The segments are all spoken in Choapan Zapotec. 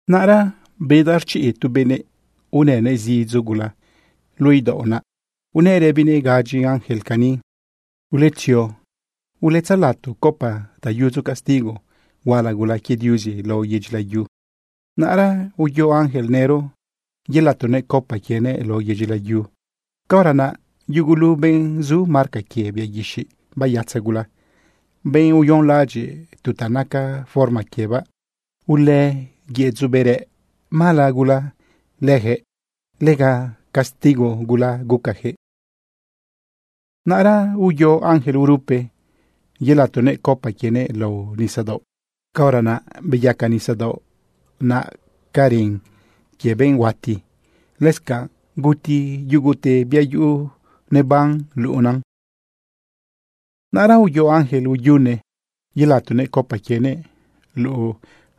Naꞌra bedaꞌ rchiꞌ tu benëꞌ unënëꞌ zidzo gula luꞌu idaoꞌ naꞌ. Unëꞌ rëbinëꞌ gadyi ángel cani: ―Uletzio uletzelato copa ta yudzo castigo huala gula quie Diuzi lao yedyi layu. Naꞌra uyo ángel nëro yelatonëꞌ copa quienëꞌ lao yedyi layu. Caora naꞌ yugulu benꞌ zu marca quie bia guixiꞌ bayatza gula, benꞌ uyonlaꞌadyiꞌ tu ta naca forma quiebaꞌ, ulë yëdzoꞌ bërëꞌ mala gula lëjëꞌ. Lega castigo gula gucajëꞌ. Naꞌra uyo ángel urupe yelatonëꞌ copa quienëꞌ lao nisadaoꞌ. Caora naꞌ beyaca nisadaoꞌ naꞌ ca ren quie benꞌ huati, lëscanꞌ guti yugute bia yuꞌu neban luꞌunan. Naꞌra uyo ángel uyune yelatonëꞌ copa quienëꞌ luꞌu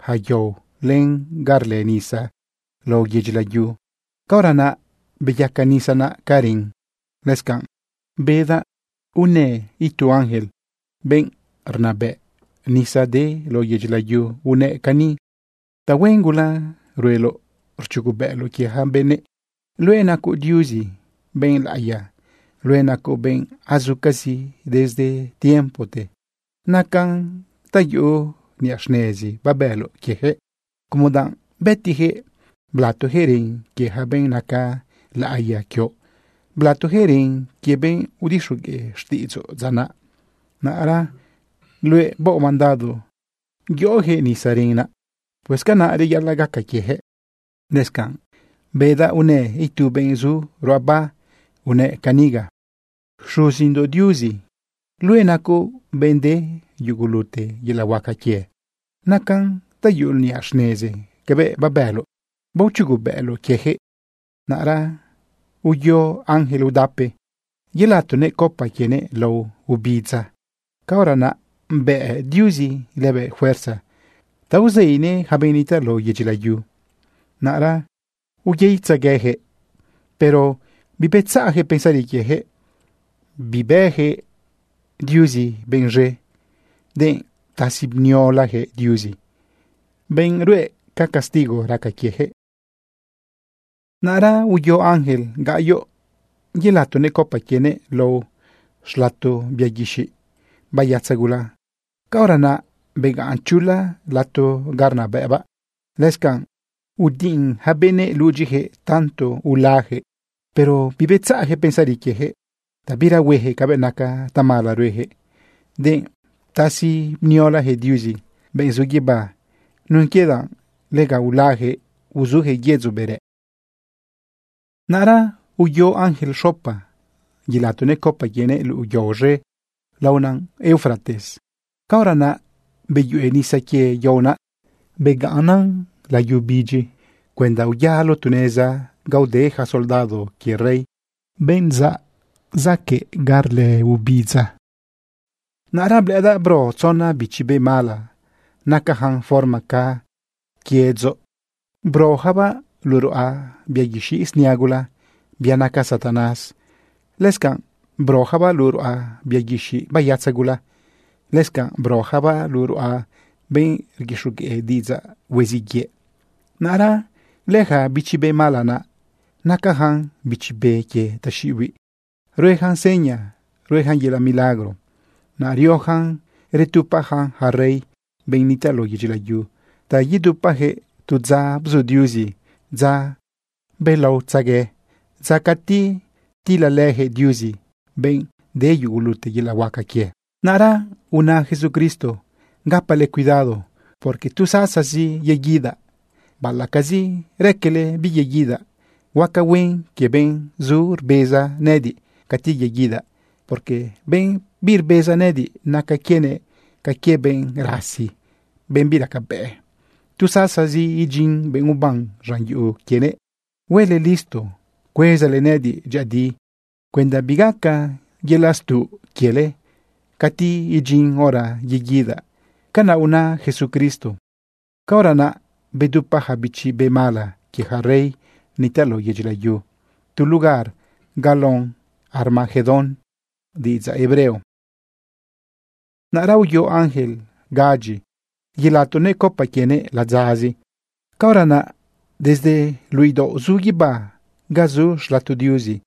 ja yao len ga rlë nisa lao yedyi layu. Caora naꞌ beyaca nisa naꞌ ca ren. Lëscanꞌ bedaꞌ unë itu ángel, benꞌ rnabëꞌ nisa de lao yedyi layu unëꞌ cani: ―Tahuen gula rueloꞌ rchugobëꞌloꞌ quie ja benëꞌ. Luëꞌ nacoꞌ Diuzi, benꞌ laꞌiya. Luëꞌ nacoꞌ benꞌ azucazi desde tiempote. Nacan ta yuꞌu niꞌa xnezi babëloꞌ quiejëꞌ, como danꞌ bëtijëꞌ blatojëꞌ ren quie yaca benꞌ naca laꞌiya quioꞌ, blatojëꞌ ren quie benꞌ udixogueꞌ xtiꞌidzoꞌ dza naꞌ. Naꞌra luëꞌ baoꞌ mandado yoꞌojëꞌ nisa ren naꞌa. Pues canaꞌ reyaꞌalaꞌ gaca quiejëꞌ. Lëscanꞌ bedaꞌ unë itu benꞌ zu ruꞌaba unëꞌ caniga: ―Xuzindoꞌ Diuzi. Luëꞌ nacoꞌ benꞌ de yugulute yelaꞌ huaca quie. Nacan ta yuꞌu niꞌa xnezi cabëꞌ babëloꞌ baochugubëꞌloꞌ quiejëꞌ. Naꞌra uyo ángel udape yelatonëꞌ copa quienëꞌ lao obidza. Caora naꞌ bëꞌ Diuzi lëbëꞌ fuerza ta uzeinëꞌ yaca benꞌ nitaꞌ lao yedyi layu. Naꞌra uyeitzaguejëꞌ, pero bibetzaꞌjëꞌ pensari quiejëꞌ, bibëjëꞌ Diuzi benꞌ z̃e, denꞌ ptasi bniolajëꞌ Diuzi, benꞌ rue ca castigo raca quiejëꞌ. Naꞌra uyo ángel gaꞌyoꞌ yelatonëꞌ copa quienëꞌ lao xlato bia guixiꞌ bayatza gula. Caora naꞌ begaꞌn chula lato ga rnabëꞌbaꞌ, lëscanꞌ udiꞌin ja benëꞌ ludyijëꞌ tanto ulajëꞌ. Pero bibetzaꞌjëꞌ pensari quiejëꞌ ta bira huejëꞌ cabëꞌ naca tamala ruejëꞌ, denꞌ ptasi bniolajëꞌ Diuzi, benꞌ zu guibá, nun quie danꞌ lega ulajëꞌ uzujëꞌ yedzoꞌ bërëꞌ. Naꞌra uyo ángel xopa yelatonëꞌ copa quienëꞌ luꞌu yao z̃e laona Eufrates. Caora naꞌ beyuꞌe nisa quie yao naꞌ, beyacan layu bidyi cuenda uyalo tu neza ga ude ja soldado quie rey, benꞌ zaꞌ zacaꞌ rlë ubidza. Naꞌra blëꞌëdaꞌ bro tzona bichi be mala nacajan forma ca quiëꞌdzoꞌ. Brojabaꞌ luꞌu ruꞌa bia guixiꞌ snia gula, bia naca Satanás. Lëscanꞌ brojabaꞌ luꞌu ruꞌa bia guixiꞌ bayatza gula. Lëscanꞌ brojabaꞌ luꞌu ruꞌa benꞌ rguixogueꞌ diꞌidzaꞌ hueziꞌ yëꞌ. Naꞌra lëja bichi be mala naꞌ, nacajan bichi be quie taxiꞌihuiꞌ. Ruejan seña, ruejan yelaꞌ milagro. Naꞌ riojan retupajan ja rey, benꞌ nitaꞌ lao yedyi layu, ta yedupajëꞌ tu dza bzu Diuzi, dza belaotzegue, dza cati tilalëjëꞌ Diuzi, benꞌ de yugulute yelaꞌ huaca quie. Naꞌra una Jesucristo: “Gapale cuidado, porque tu sasazi yeguidaꞌ baꞌalaꞌcazi raquele biyeguidaꞌ. Huaca huen quie benꞌ zu rbeza nëꞌëdiꞌ cati yeguidaꞌ, porque benꞌ birbeza nëꞌëdiꞌ, naca quienëꞌ ca quie benꞌ rasi, benꞌ biracabëꞌ tu sasazi idyin benꞌ uban z̃an yuꞌu quienëꞌ. Huele listo cuezale nëꞌëdiꞌ dyëꞌëdi cuenda bigaca yelaꞌ stuꞌ quiele cati idyin hora yeguidaꞌ.” Canaꞌ una Jesucristo. Caora naꞌ betupa ja bichi be mala quie ja rey nitaꞌ lao yedyi layu tu lugar ga lao Armagedón diꞌidzaꞌ hebreo. Naꞌra uyo ángel gadyi yelatonëꞌ copa quienëꞌ ladzazi. Caora naꞌ desde luꞌu idaoꞌ zu guibá ga zu xlato Diuzi,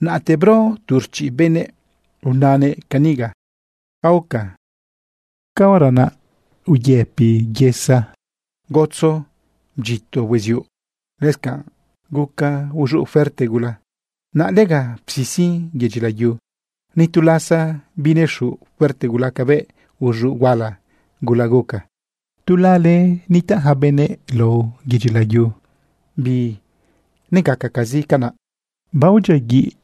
naꞌte bro tu rchiꞌ beneꞌ unanëꞌ caniga: ―Aoca. Caora naꞌ uyëpi yesa, gotzo bdyito hueziuꞌ, lëscanꞌ guca uz̃uꞌ fuerte gula. Naꞌ lega psisin yedyi layu. Ni tu lasa binez̃uꞌ fuerte gula cabëꞌ uz̃uꞌ huala gula guca. Tu lala nitaꞌ ja benëꞌ lao yedyi layu, binegacacazi canaꞌ. Aodyiaguiꞌ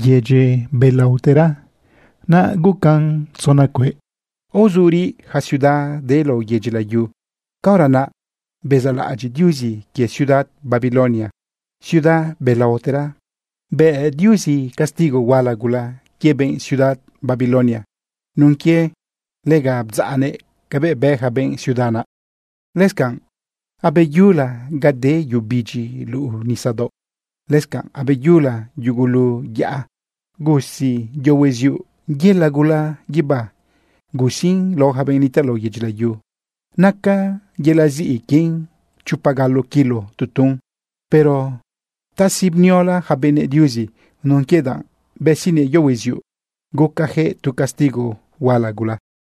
lëyedyi belaotera, naꞌ gucan tzona cueꞌ. Aozuriꞌ ja ciudad de lao yedyi layu. Caora naꞌ bezaꞌlaꞌadyiꞌ Diuzi quie ciudad Babilonia, ciudad belaotera. Bë Diuzi castigo huala gula quie benꞌ ciudad Babilonia nun quie lega bdzaꞌnëꞌ cabëꞌ bë ja benꞌ ciudad naꞌ. Lëscanꞌ abeyula ga de yu bidyi luꞌu nisadaoꞌ, lëscanꞌ abeyula yugulu yaꞌa. Gusiꞌ yo hueziuꞌ yela gula guibá. Gusiꞌn lao ja benꞌ nitaꞌ lao yedyi layu. Naca yelaꞌ ziꞌi quien chopa galo kilo tu tun. Pero ptasi bniola ja benëꞌ Diuzi nun quie danꞌ besiꞌnëꞌ yo hueziuꞌ gucajëꞌ tu castigo huala gula.